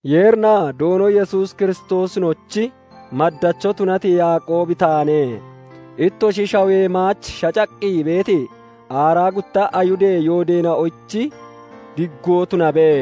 Yeerinaa Doono Yesuus Kiristoosinochi maddacho tunati Yaaqoobi taane. Ittoshi shawoyee maach shacaqqi beeti, aaraa gutta Ayihudee yoodeena'oyich diggoo tunabe.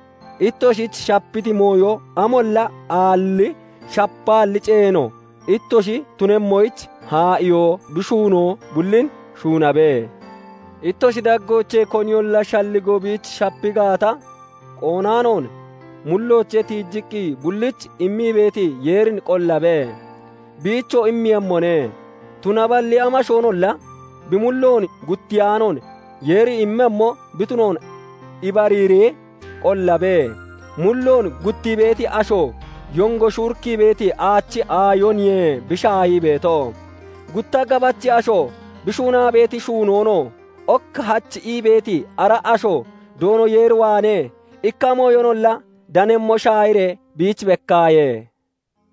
Ittoshich shapiti mooyo amolla aalli, shapaalli ceeno ittoshi tunemmoyich haa'iyoo bi shuunoo bullin shuunabe. Ittoshi daggoochee koniyolla shalligoo biich shapi gaata, qoonaanoon mulloochee tiijiqqi bullich immii beeti Yeerin qollabe; biichoo immeeyemmone. Tunaballi amashoonolla bi mulloon guttiyaanoon Yeeri immemmo bi tunoon ibariiree qollabe; mulloon guttii beeti asho yongo shuurikkii beeti aachi aayoniye bi shaahii beeto. Gutta gabachi asho, bi shuunaa beeti shuunoonoo ok hach ii beeti ara asho Doono Yeer waanee ikka mooyinolla danemmo shaahiree biich bekkaaye.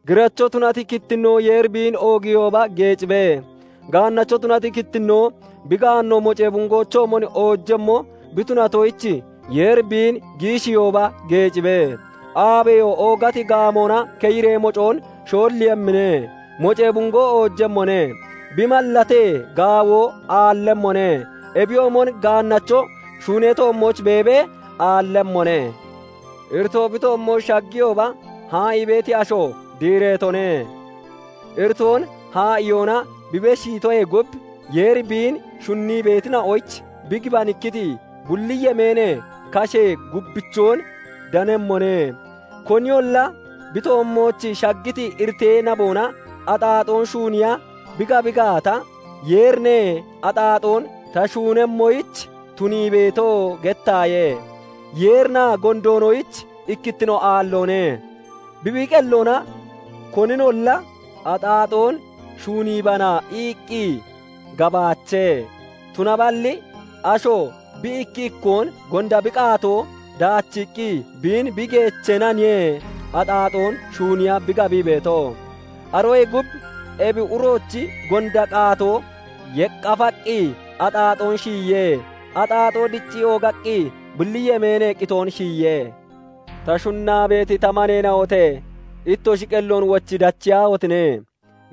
Giracho tunati kittinnoo Yeeri biin oogiihooba geecibe; gaannacho tunati kittinnoo bi gaanno mocee bungoochoomon oojemmo bi tunatoyich, Yeeri biin bi giishiihooba geecibe; aabeyo oogati gaamoona keyiree mocoon shoolliiyemmine; mocee bungoo oojemmone; bi mallatee gaawoo aallemmone; ebiyoomon gaannacho shuunee toommooch beebee aallemmone. Iritoo bi toommooch shagiyooba haa'ii beeti asho diireetone; iritoon haa'iyoona bi beshiitoyee gub, Yeeri biin shunnii beetina'oyich bi gibanikkiti bulli yemeenee kashee gubbichoon danemmone. Koniyolla bi toommooch shaggiti iritee naboona axaaxoon shuuniya bi gabi gaata, "Yeerine axaaxoon ta shuunemmoyich tunii beeto" gettaaye. Yeerinaa gondoonoyich ikkittino aalloone; bi, bi qelloona koninolla "Axaaxoon shuuniibana" iqqi gabaache. Tunaballi asho bi ikki ikkoon gonda bi qaatoo dachiqqi biin bi geechenaniye axaaxoon shuuniya bi gabii beeto. Aroyee gub ebi uroochi gonda qaatoo yeqqafaqqi axaaxoon shiyiye; axaaxoo diccii oogaqqi bulli yemeenee qitoon shiyiye. Ta shunnaa beeti ta maneena'ote! Ittoshi qelloon wochi dachiyaahotine!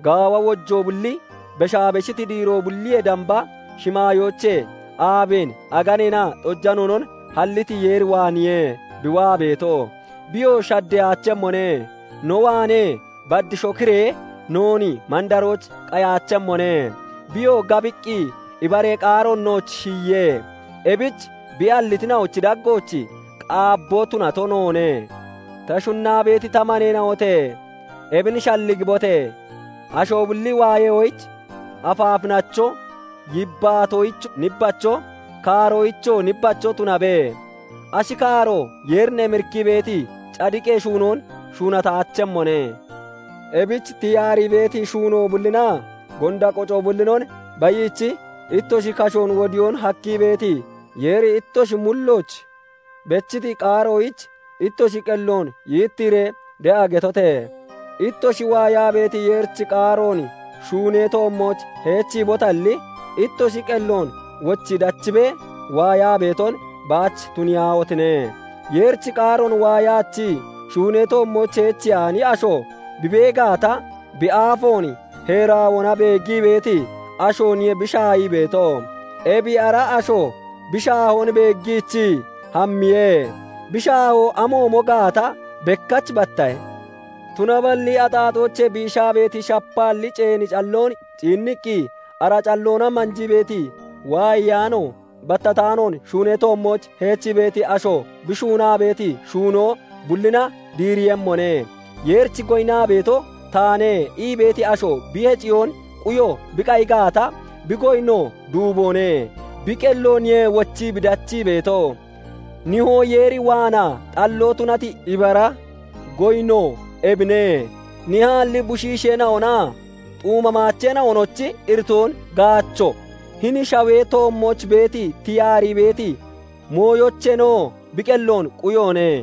Gaawa wojoo bulli, beshaa beshiti diiroo bulliyoo damba shimaayoochee, aabeen, aganeenaa xojanoonon halliti Yeer waaneeniye bi waa beeto. Biyoo shaddeyaachemmone; no waanee bad shokiree noon mandarooch qayaachemmone. Biyoo gabiqqi ibaree qaaroona noon shiyiye; ebich bi hallitina'ochi daggooch qaabboo tunato noone. Ta shunnaa beeti ta maneena'ote! Ebin shalligibote! Asho bulli waayoyich afaafinacho, yibbaatoyich nibbacho, kaaroyichoo nibbacho tunabe. Ashi kaaro Yeerin emirikkii beeti cadiqee shuunoon shuunataachemmone. Ebich tiyaarii beeti shuunoo bullinaa gonda qoco bullinon bayiichi, ittoshi kashoon wodiyoon hakkii beeti, Yeeri ittoshi mullooch bechiti qaaroyich ittoshi qelloon yittiiree de'a getote! Ittoshi waayaa beeti Yeerichi qaaroon shuunee toommooch heechiibotalli, ittoshi qelloon wochi dachibee waayaa beeton baach tuniyaahotine! Yeerichi qaaroon waayaachii, shuunee toommooch heechiyaani asho bi bee gaata, bi aafoon heeraawoona beeggii beeti ashooniye bi shaahii beeto; ebi ara asho bi shaahoon beeggiichii hammiye; bi shaahoo amoomo gaata bekkach battahe. Tunaballi axaaxoochee biishaa beeti, shapaalli ceeni calloon ciinniqqi ara calloona manjii beeti, waayaanoo battataanoon shuunee toommooch heechii beeti asho, bi shuunaa beeti shuunoo bullina diireeyemmone. "Yeerich goyinnaa beeto taane" ii beeti asho bi heciyoon quyo bi qayi gaata, bi goyinno duuboone; bi qellooniye wochii bi dachii beeto. Nihoo Yeer waanaa xalloo tunati ibara goyinno ebine:- nihaalli bushiisheena'onaa xuuma maacheena'onochi iritoon gaacho, hini shawee toommooch beeti, tiyaarii beeti mooyoocheenoo bi qelloon quyoone.